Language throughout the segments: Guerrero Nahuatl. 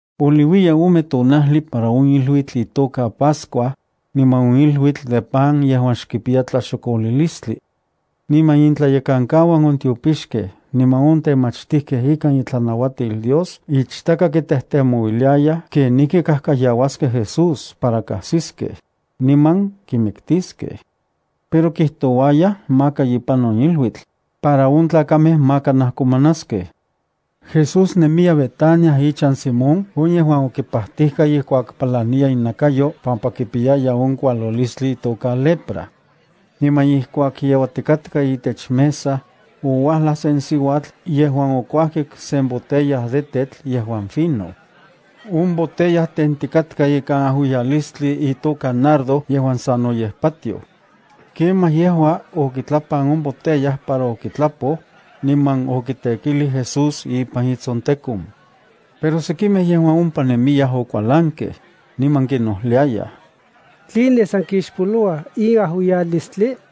Poliuiya ome tonajli para on iluitl itoka Pascua, niman on iluitl de pan yejuan xkipiya tlaxokolilistli. Niman intlayekankauan on tiopixkej niman on temachtijkej ikan itlanauatil Dios ichtaka kitejtemouiliayaj kenijki kajkayauaskej Jesús para kajsiskej, niman kimiktiskej. Pero kijtouayaj maka ipan on iluitl, para on tlakamej maka najkomanaskej. Jesús nemiya Betania ichan Simón on yejuan okipatijka ijkuak palaniya inakayo pampa kipiyaya on kualilistli itoka lepra. Niman ijkuak yeuatikatka itech mesa, ouajlaj sen siuatl yejuan okuajkik sen botella de tetl yejuan fino. On botella tentikatka ikan ajuiyalistli itoka nardo yejuan sanoyej patioj. Kemaj yejua okitlapan on botella para okitlapoj, niman okitekilij Jesús ipan itsontekon. Pero sekimej yejuan ompa nemiyaj okualankej, niman kinnojliayaj: —¿Tline san kixpoloua in ajuiyalistli?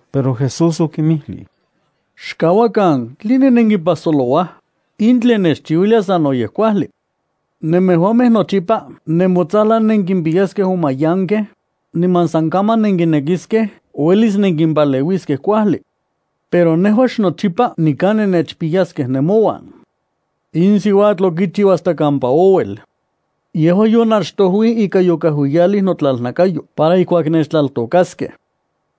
Pero Jesús okinmijlij: —Xkauakan, ¿tline nenkipajsolouaj? In tlen nechchiuilia sanoyej kuajli. Nemejuamej nochipa nemotsajlan nenkimpiyaskej on mayankej, niman san kaman nenkinekiskej uelis nenkimpaleuiskej kuajli. Pero nejua xnochipa nikan nennechpiyaskej nemouan. In siuatl okichiu hasta kampa ouel. Yejua yonachtojuij ika yokajuiyalij notlalnakayo para ijkuak nechtlaltokaskej.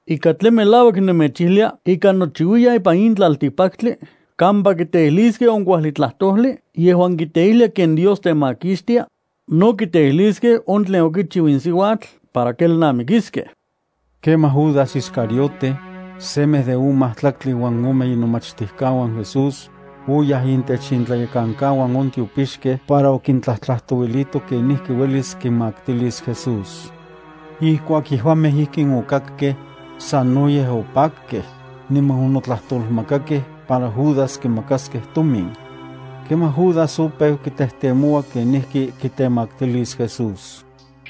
Ika tlen melauak nemechijlia ika nochiuiyan ipan in tlaltikpaktli kampa kiteijliskej on kuajli tlajtojli yejuan kiteijlia ken Dios temakixtia, no kiteijliskej on tlen okichiu in siuatl para kelnamikiskej. Kemaj Judas Iscariote, semej de on majtlaktli uan ome inomachtijkauan Jesús, oyaj intech intlayekankauan on tiopixkej para okintlajtlajtouilito kenijki uelis kinmaktilis Jesús. Ijkuak yejuamej ijkin okakkej, sanoyej opakkej, niman onotlajtolmakakej para Judas kimakaskej tomin. Kemaj Judas opeu kitejtemoua kenijki kitemaktilis Jesús.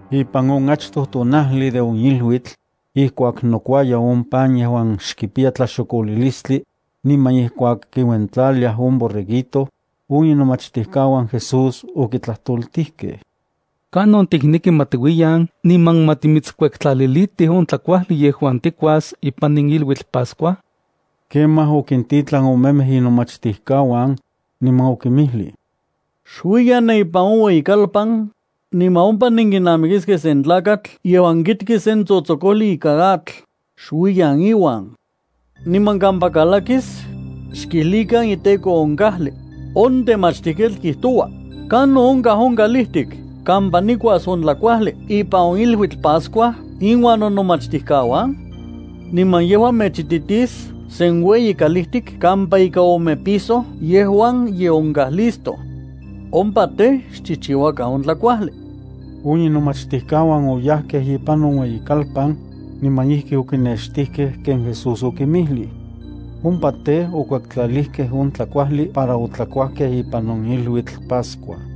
Ipan on achtoj tonajli de on iluitl, ijkuak nokuaya on pan yejuan xkipiya tlaxokolilistli, niman ijkuak kiuentlaliaj on borreguito, on inomachtijkauan Jesús okitlajtoltijkej: —¿Kanon tikneki ma tiuiyan niman ma timitskuektlalilitij on tlakuajli yejuan tikuas ipan in iluitl Pascua? Kemaj okintitlan omemej inomachtijkauan, niman okinmijlij: —Xuiyan ne ipan on ueyikalpan, niman ompa nenkinamikiskej sen tlakatl yejuan kikti sen tsotsokojli ikan atl. Xuiyan iuan. Niman kampa kalakis, xkijlikan iteko on kajli: “On Temachtijketl kijtoua: ¿kanon onkaj on kalijtik kampa nikuas on tlajkuajli ipan in iluitl Pascua inuan nonomachtijkauan?” Niman yejua mechititis sen ueyi kalijtik kampa ika ome piso yejuan ye onkaj listo. Ompa tej, xchijchiuakan on tlakuajli. On inomachtijkauan oyajkej ipan on ueyikalpan, niman ijki okinextijkej ken Jesús okinmijlij. Ompa tej, okuektlalijkej on tlakuajli para otlakuajkej ipan on iluitl Pascua.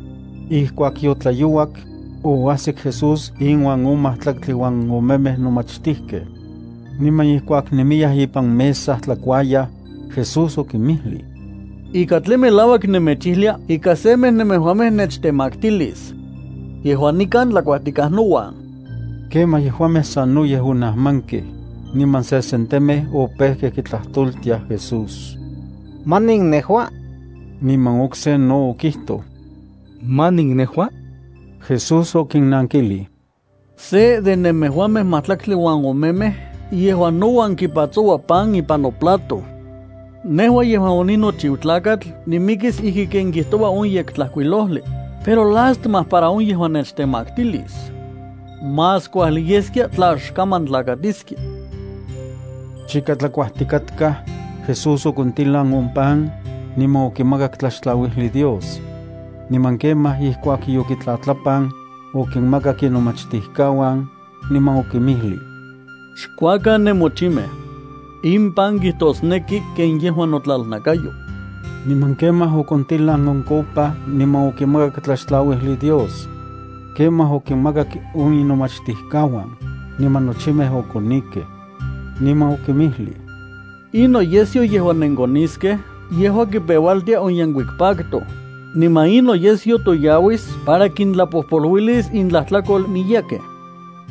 Ijkuak yotlayouak, oajsik Jesús inuan on majtlaktli uan omemej nomachtijkej. Niman ijkuak nemiyaj ipan mesa tlakuayaj, Jesús okinmijlij: —Ika tlen melauak nemechijlia ika semej nemejuamej nechtemaktilis. Yejua nikan tlakuajtikaj nouan. Kemaj yejuamej sanoyej onajmankej, niman sesentemej opejkej kitlajtoltiaj Jesús: —¿Manin nejua? Niman okse no okijtoj: —¿Manin nejua? Jesús okinnankijlij: —Se de nemejuamej majtlaktli uan omemej yejuan nouan kipatsoua pan ipan noplato. Nejua yejuan oninochiu Tlakatl nimikis ijki ken kijtoua on Yektlajkuilojli, pero lástima para on yejuan nechtemaktilis. Más kuajli yeskia tla xkaman tlakatiskia. Chika tlakuajtikatkaj, Jesús okontilan on pan, niman okimakak tlaxtlauijli Dios. Niman kemaj ijkuak yokitlatlapan, okinmakak inomachtijkauan, niman okinmijlij: —Xkuakan nemochimej. In pan kijtosneki ken yejua notlalnakayo. Niman kemaj okontilan on copa niman okimakak tlaxtlauijli Dios. Kemaj okinmakak on inomachtijkauan, niman nochimej okonikej. Niman okinmijlij: —In noyesyo yejuan nenkoniskej yejua kipeualtia on yenkuik pacto, niman in noyesyo toyauis para kintlapojpoluilis intlajtlakol miyekej.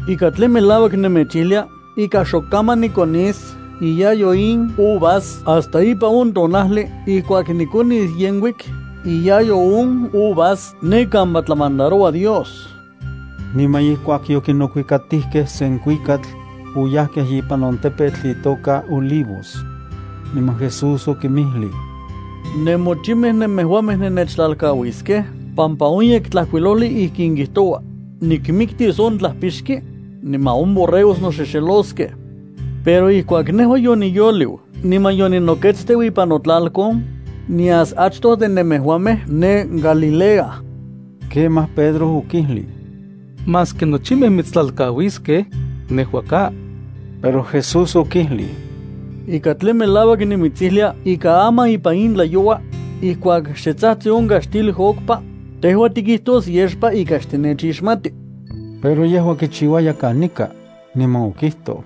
Ika tlen melauak nemechijlia ika xok kaman nikonis iyayo in uvas hasta ipan on tonajli ijkuak nikonis yenkuik iyayo on uvas ne kampa tlamandaroua Dios. Niman ijkuak yokinokuikatijkej sen kuikatl, oyajkej ipan on tepetl itoka Olivos. Niman Jesús okinmijlij: —Nemochimej nemejuamej nennechtlalkauiskej pampa on Yektlajkuilojli ijkin kijtoua: “Nikmiktis on tlajpixki, niman on borregos noxexeloskej.” Pero ijkuak nejua yoniyoliu niman yoninoketsteu ipan notlalkon, nias achtoj de nemejuamej ne Galilea. Kemaj Pedro okijlij: —Maski nochimej mitstlalkauiskej, nejua ka. Pero Jesús okijlij: —Ika tlen melauak nimitsijlia ika aman ipan in tlayoua, ijkuak xe tsajtsi on kaxtil okpa, tejua tikijtos yexpa ika xtinechixmati. Pero yejua kichiuaya kanika, niman okijtoj: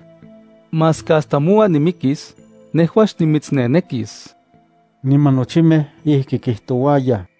—Maski hasta mouan nimikis, nejua xnimitsnenekis ika xnimitsixmati. Niman nochimej ijki kijtouayaj.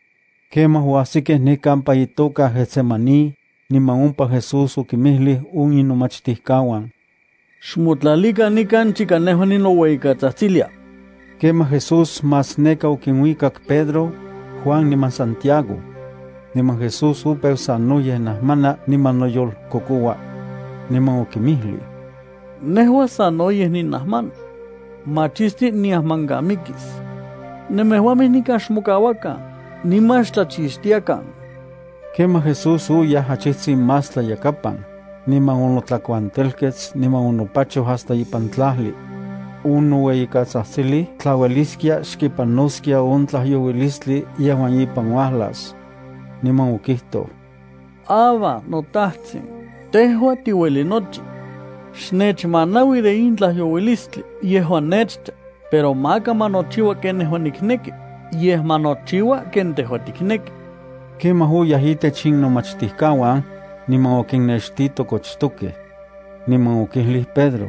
Kemaj oajsikej ne kampa itoka Getsemaní, niman ompa Jesús okinmijlij on inomachtijkauan: —Xmotlalikan nikan chika nejua ninoueyikatsajtsilia. Kemaj Jesús más neka okinuikak Pedro, Juan niman Santiago. Niman Jesús opeu sanoyej najmana niman noyolkokoua. Niman okinmijlij: —Nejua sanoyej ninajmana. Machisti niajmankamikis. Nemejuamej nikan xmokauakan, niman xtlachixtiakan. Kemaj Jesús oyaj achijtsin más tlayakapan, niman onotlakuantelkets niman onopachoj hasta ipan tlajli. Onoueyikatsajtsilij tla ueliskia xkipanoskia on tlajyouilistli yejuan ipan uajlas. Niman okijtoj: —Abba, noTajtsin, tejua tiueli nochi. Xnechmanaui de in tlajyouilistli yejuan nechcha, pero maka ma nochiua ken nejua nikneki, yej ma nochiua ken tejua tikneki. Kemaj oyaj intech inomachtijkauan, niman okinnextito kochtokej. Niman okijlij Pedro: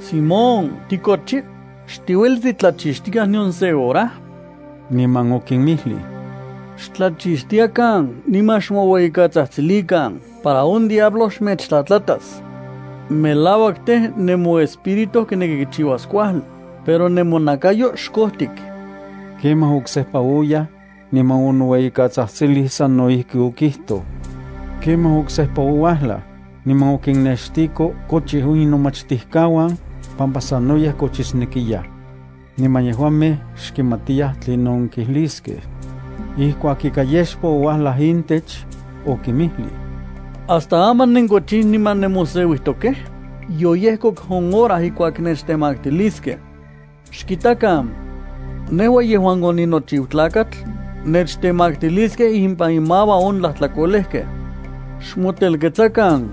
—Simón, ¿tikochi? ¿Xtiueli titlachixtikaj nion se hora? Niman okinmijlij: —Xtlachixtiakan, niman xmoueyikatsajtsilikan para on diablo xmechtlatlatas. Melauak tej, nemoespíritu kineki kichiuas kuajli, pero nemonakayo xkojtik. Kemaj oksejpa oyaj, niman onoueyikatsatsilij sano ijki okijtoj. Kemaj oksejpa ouajlaj, niman okinnextijko kochij on inomachtijkauan, pampa sanoyej kochisnekiyaj. Niman yejuamej xkimatiyaj tlinon kijliskej. Ijkuak ika yexpa ouajlaj intech, okinmijlij: —¿Hasta aman nenkochij niman nemoseuijtokej? Yoyejkok on hora ijkuak nechtemaktiliskej. Xkitakan. Nejua, yejuan oninochiu Tlakatl, nechtemaktiliskej impan inmauan on tlajtlakolejkej. Xmotelketsakan.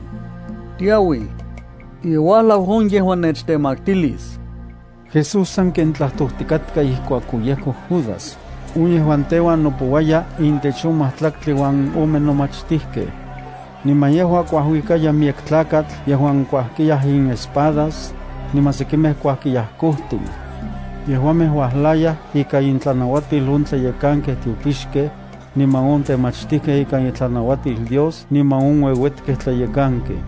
Tiauij. Ye uajlau on yejuan nechtemaktilis. Jesús sanken tlajtojtikatka ijkuak oyejkok Judas, on yejuan teuan nopouaya intech on majtlaktli uan ome nomachtijkej. Niman yejua kuajuikaya miyek tlakatl yejuan kuajkiyaj inespadas, niman sekimej kuajkiyaj kojtin. Yejuamej uajlayaj ikan intlanauatil on tlayekankej tiopixkej, niman on temachtijkej ikan itlanauatil Dios niman on ueuetkej tlayekankej.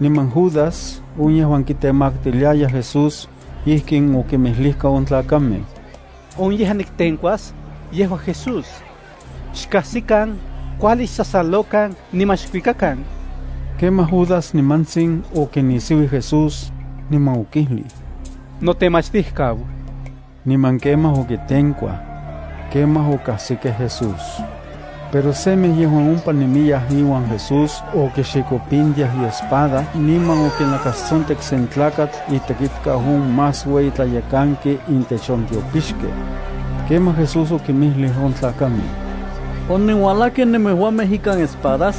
Niman Judas, on yejuan kitemaktiliaya Jesús, ijkin okinmijlijka on tlakamej: —On yejuan niktenkuas, yejua Jesús. Xkajsikan, kuajli xsasalokan niman xkuikakan. Kemaj Judas nimantsin okinisiuij Jesús, niman okijlij: —Notemachtijkau. Niman kemaj okitenkuaj. Kemaj okajsikej Jesús. Pero semej yejuan ompa nemiyaj iuan Jesús okixikopintiaj iespada niman okinakastsontek sen tlakatl itekitkau on más ueyi tlayekanki intech on tiopixkej. Kemaj Jesús okinmijlij on tlakamej: —¿Onenuajlajkej nemejuamej ikan espadas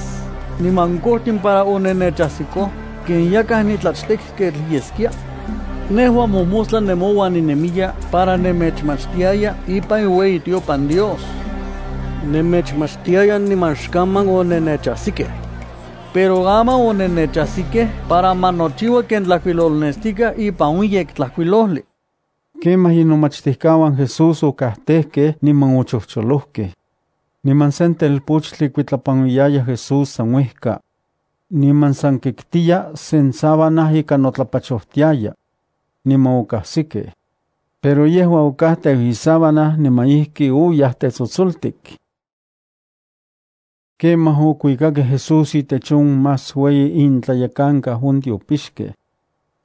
niman kojtin para onennechajsikoj ken yakaj nitlachtekketl yeskia? Nejua mojmostla nemouan ninemiya para nemechmachtiaya ipan iueyitiopan Dios. Nemechmachtiaya niman xkaman onennechajsikej. Pero aman onennechajsikej para ma nochiua ken tlajkuilolnestikaj ipan on Yektlajkuilojli. Kemaj inomachtijkauan Jesus okajtejkej, niman ochojcholojkej. Niman sen telpochtli kuitlapanuiyaya Jesús san uejka. Niman san kiktiya sen sábana ika notlapachojtiaya. Niman okajsikej, pero yejua okajteu isábana niman ijki oyaj tetsotsoltik. Kemaj okuikakej Jesús itech on más ueyi intlayekankau on tiopixkej.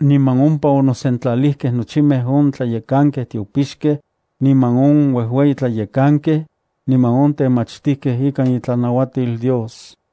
Niman ompa onosentlalijkej nochimej on tlayekankej tiopixkej, niman on uejueyi tlayekankej, niman on temachtijkej ikan itlanauatil Dios.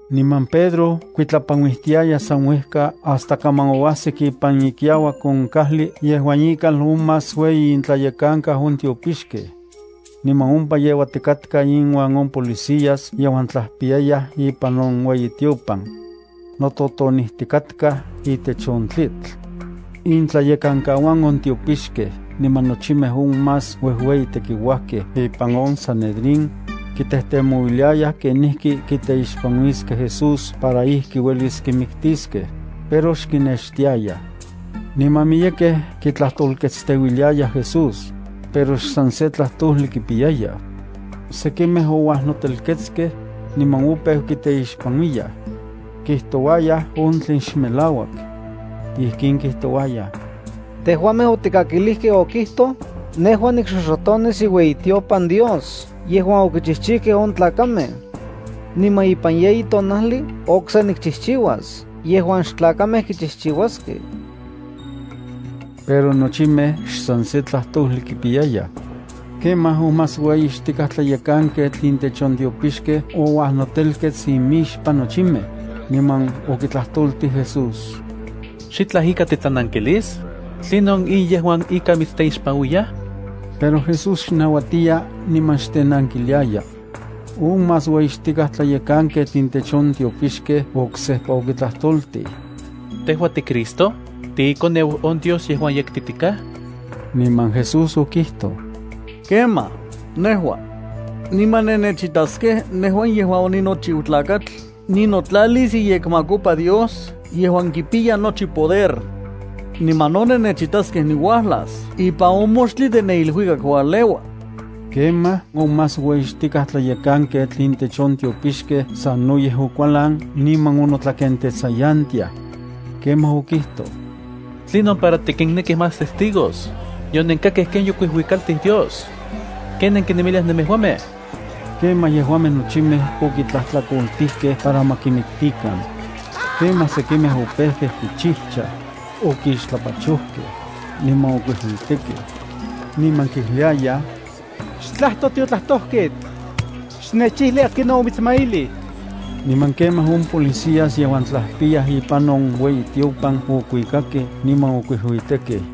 Niman Pedro kuitlapanuijtiaya san uejka hasta kaman oajsik ipan ikiauak on kajli yejuan ikal on más ueyi intlayekankau on tiopixkej. Niman ompa yeuatikatka inuan on policías yejuan tlajpiyayaj ipan on ueyitiopan. Nototonijtikatkaj itech on tlitl. Intlayekankauan on tiopixkej niman nochimej on más uejueyi tekiuajkej ipan on sanedrín kitejtemouiliayaj kenijki kiteixpanuiskej Jesús para ijki uelis kimiktiskej, pero xkinextiayaj. Niman miyekej kitlajtolketsteuiliayaj Jesús, pero xsan se tlajtojli kipiyayaj. Sekimej ouajnotelketskej, niman opeu kiteixpanuiyaj. Kijtouayaj on tlen xmelauak. Ijkin kijtouayaj: —Tejuamej otikakilijkej okijtoj: “Nejua nikxoxotonis iueyitiopan Dios yejuan okichijchijkej on tlakamej. Niman ipan yeyi tonajli okse nikchijchiuas yejuan xtlakamej kichijchiuaskej.” Pero nochimej xsan se tlajtojli kipiyayaj. Kemaj on más ueyixtikaj tlayekanketl intech on tiopixkej ouajnotelkets imixpan nochimej, niman okitlajtoltij Jesús: —¿Xitlaj ika titlanankilis? ¿Tlinon in yejuan ika mitsteixpanuiyaj? Pero Jesús xnauatiya niman xtenankiliaya. On más ueyixtikaj tlayekanketl intech on tiopixkej oksejpa okitlajtoltij: —¿Tejua tiCristo, tiiKoneu on Dios yejuan yektitikaj? Niman Jesús okijtoj: —Kemaj, nejua. Niman nennechitaskej nejua yejuan oninochiu Tlakatl ninotlalis iyekmakopa Dios yejuan kipiya nochi poder. Niman no nennechitaskej niuajlas ipan on moxtli de ne iluikak ualeua. Ijkuakon on más ueyixtikaj tlayekanketl intech on tiopixkej sanoyej okualan niman onotlakentetsayantiaj. Kemaj okijtoj: —¿Tlinon para tikinnekij más testigos? Yonenkakkej ken yokuijuikaltij Dios. ¿Ken nenkinemiliaj nemejuamej? Kemaj yejuamej nochimej okitlajtlakoltijkej para ma kimiktikan. Kemaj sekimej opejkej kichijchaj, okixtlapachojkej, niman okuijuitekej. Niman kijliayaj: —Xtlajto tiotlajtojketl. Xnechijli akinon omitsmailij. Niman kemaj on policías yejuan tlajpiyaj ipan on ueyitiopan okuikakej, niman okuijuitekej.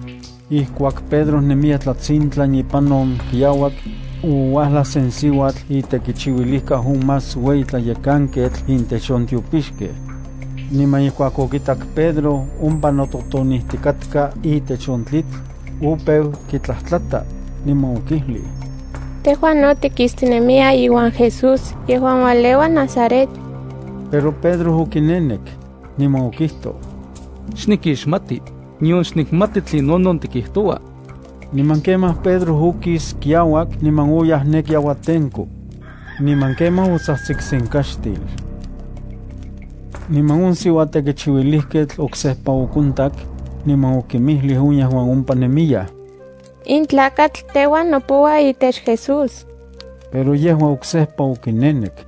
Ijkuak Pedro nemiya tlatsintlan ipan on kiauak, ouajlaj sen siuatl itekichiuilijkau on más ueyi tlayekanketl intech on tiopixkej. Niman ijkuak okitak Pedro ompa nototonijtikatka itech on tlitl, opeu kitlajtlata, niman okijlij: —Tejua no tikistinemiya iuan Jesús yejuan ualeua Nazaret. Pero Pedro okinenek, niman okijtoj: —Xnikixmati, nion xnikmati tlinonon tikijtoua. Niman kemaj Pedro okis kiauak, niman oyaj ne kiauatenko. Niman kemaj otsajtsik sen kaxtil. Niman on siuatekichiuilijketl oksejpa okontak, niman okinmijlij on yejuan ompa nemiyaj: —In tlakatl teuan nopoua itech Jesús. Pero yejua oksejpa okinenek.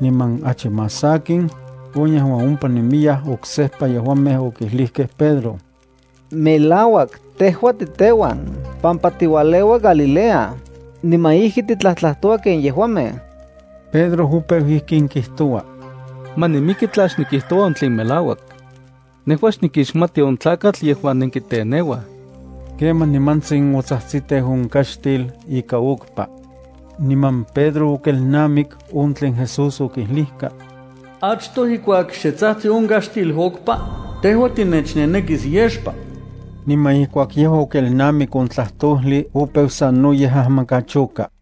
Niman achi más sakin, on yejuan ompa nemiyaj oksejpa yejuamej okijlijkej Pedro: —Melauak, tejua titeuan pampa tiualeua Galilea, niman ijki titlajtlajtoua ken yejuamej. Pedro opeu ijkin kijtoua: —Ma nimiki tla xnikijtoua on tlen melauak. Nejua xnikixmati on tlakatl yejuan nenkiteneuaj. Kemaj nimantsin otsajtsiteu on kaxtil ika okpa. Niman Pedro okelnamik on tlen Jesús okijlijka: “Achtoj ijkuak xe tsajtsi on kaxtil okpa, tejua tinechnenekis yexpa.” Niman ijkuak yejua okelnamik on tlajtojli, opeu sanoyej ajmankachoka.